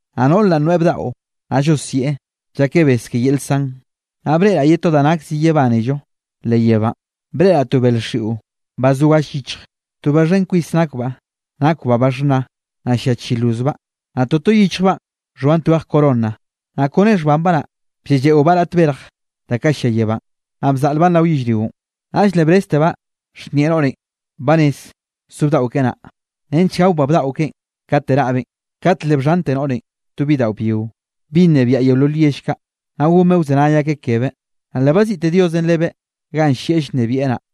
Naꞌ noꞌr naꞌ noeꞌ bdaꞌo, naꞌ llosieꞌ, llakeꞌ bes ke yel san. Naꞌ breꞌraꞌ ye to da nak zi yebánello leꞌ yebánꞌ, breꞌraꞌ to bel xiꞌo ba zo galle yichj to ba xhen kwis nakbaꞌ. Nakbaꞌ ba xhna, naꞌ llia chi lozbaꞌ, naꞌ toto yichjbaꞌn xhoan twej corona. Naꞌ kone xhbanbaꞌ naꞌ, blleꞌlleꞌobaꞌ raꞌt berj da kaꞌ llia yebánꞌ, naꞌ bzaꞌlbaꞌn rao yellrionꞌ. Naꞌll le breztebaꞌ xhnieꞌ noꞌrenꞌ, ba rez so bdaꞌo keꞌe naꞌ, nench gaobaꞌ bdaꞌo keꞌen kate raꞌbeꞌn. Kat le bxhante noꞌrenꞌ to bidaꞌo byio, bi nnebiaꞌ yeolol yell kaꞌ, naꞌ gonbeꞌ wzenay akeꞌ kebeꞌ. Naꞌ le baziꞌte Diosenꞌ lebeꞌ ganꞌ llieꞌ llnebieꞌ naꞌ.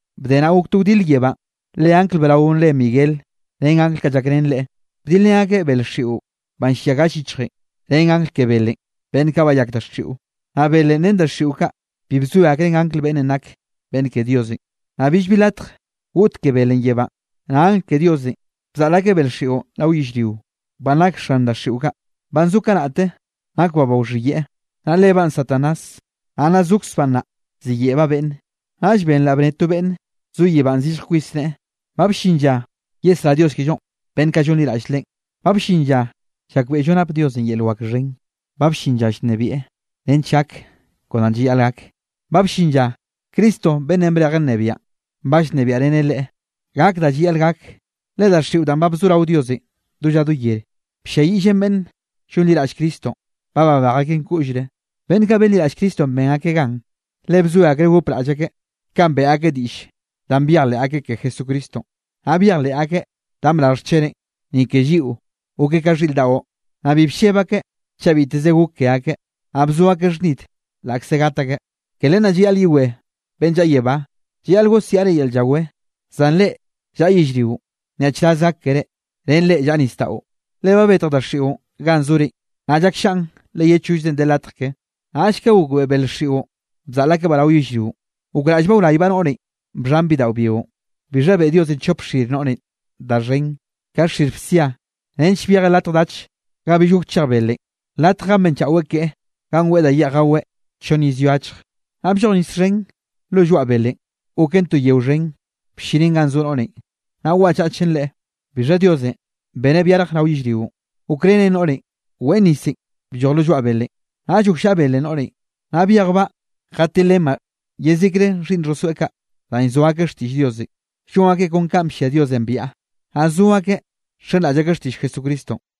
Bde naꞌ gok to wdile yebánꞌ, le angl brao re Miguel ren angl kaꞌ llakrén leꞌe, bdilrén akeꞌ bel xiꞌo banꞌ llia galle yichjenꞌ, ren angl ke belenꞌ, beꞌnn kaꞌ bayak daxiꞌo. Naꞌ belenꞌ ren daxiꞌo kaꞌ bi bzoe akreꞌn angl beꞌnnenꞌ nake beꞌnn ke Diosenꞌ, naꞌ billbi latj goꞌt ke belenꞌ yebánꞌ. Naꞌ angl ke Diosenꞌ bzaꞌl ake bel xiꞌon rao yellrio, banꞌ nak xan daxiꞌo kaꞌ, banꞌ zo kanaꞌte nakbaꞌ ba wxhiyeꞌe, naꞌ lebaꞌn Satanás, naꞌ nna zokzbaꞌ nnaꞌ, ziyeꞌbaꞌ beꞌnne. Naꞌll benraꞌ bnne to beꞌnn zo yebánꞌ zillj kwis neꞌe: —Ba bllin lla yesrá Dios kellonꞌ beꞌnn kaꞌ llonliraꞌll Leꞌen, ba bllin lla llakbeꞌllo nap Diosenꞌ yel wak xhen, ba bllin lla llnebieꞌ nench gak kon da llayaꞌl gak. Ba bllin lla Cristo beꞌnnenꞌ brejeꞌ nnebiaꞌn, ba llnebiaꞌreneꞌ Leꞌe. Gak da llayaꞌl gak, le daxiꞌo danꞌ ba bzo rao Diosenꞌ do lla do yer, blliayiꞌllen beꞌnn llonliraꞌll Cristonꞌ, ba babej akeꞌn koꞌllre. Beꞌnn kaꞌ benliraꞌll Cristonꞌ ben akeꞌ gan, le bzoe akreꞌ gopraꞌll akeꞌ, kanꞌ beꞌe akeꞌ diꞌll danꞌ byejleꞌ akeꞌ ke Jesucristonꞌ, naꞌ byejleꞌ akeꞌ danꞌ brarj xcheneꞌ, ni ke lliꞌo gokeꞌ ka xhiꞌr daꞌo, naꞌ bi blleb akeꞌ chaꞌ biteze gok ke akeꞌ, naꞌ bzo akeꞌ xhnid laꞌkze gat akeꞌ. Ke len naꞌ llayaꞌl yewé beꞌnn llaꞌa yebá, llayaꞌl gosiaꞌre yel llawé, zan reꞌ llaꞌa yellrionꞌ nyaꞌchraz gak keré, ren reꞌ llaꞌa nisdaꞌo, le ba betj daxiꞌon ganꞌ zore, naꞌ llakllaꞌn le ye chollzenꞌ de latj ke. Naꞌll ka gokbeꞌe bel xiꞌon bzaꞌl akebaꞌ rao yellrionꞌ, gokraꞌllbaꞌ wraybaꞌ noꞌrenꞌ bxhan bidaꞌo byionꞌ. Bixha beꞌe Diosenꞌ chop xir noꞌrenꞌ da xhen, ka xir bsia nench byejeꞌ latj dach ga bill gok chej belenꞌ, latj ganꞌ benchaꞌweꞌ keꞌe ganꞌ weꞌe da yeꞌj gaweꞌ chonn iz ye achje. Naꞌ blloj nis xhen lo lloaꞌ belenꞌ goken to yeo xhen, bllinen ganꞌ zo noꞌrenꞌ, naꞌ waꞌchachen leꞌe. Bixha Diosenꞌ beneꞌ byarje rao yellrionꞌ, gokrenen noꞌrenꞌ weꞌn nisenꞌ blloj lo lloaꞌ belenꞌ. Naꞌll gokllaꞌa belenꞌ noꞌrenꞌ, naꞌ byejbaꞌ jatilrenbaꞌ yezikre xhiꞌnn xhosoeꞌ kaꞌ, danꞌ llzoa akeꞌ xtiꞌll Diosenꞌ, llon akeꞌ kon kanꞌ bllia Diosenꞌ biaꞌa, naꞌ zo akeꞌ nxenraꞌll akeꞌ xtiꞌll Jesucristonꞌ.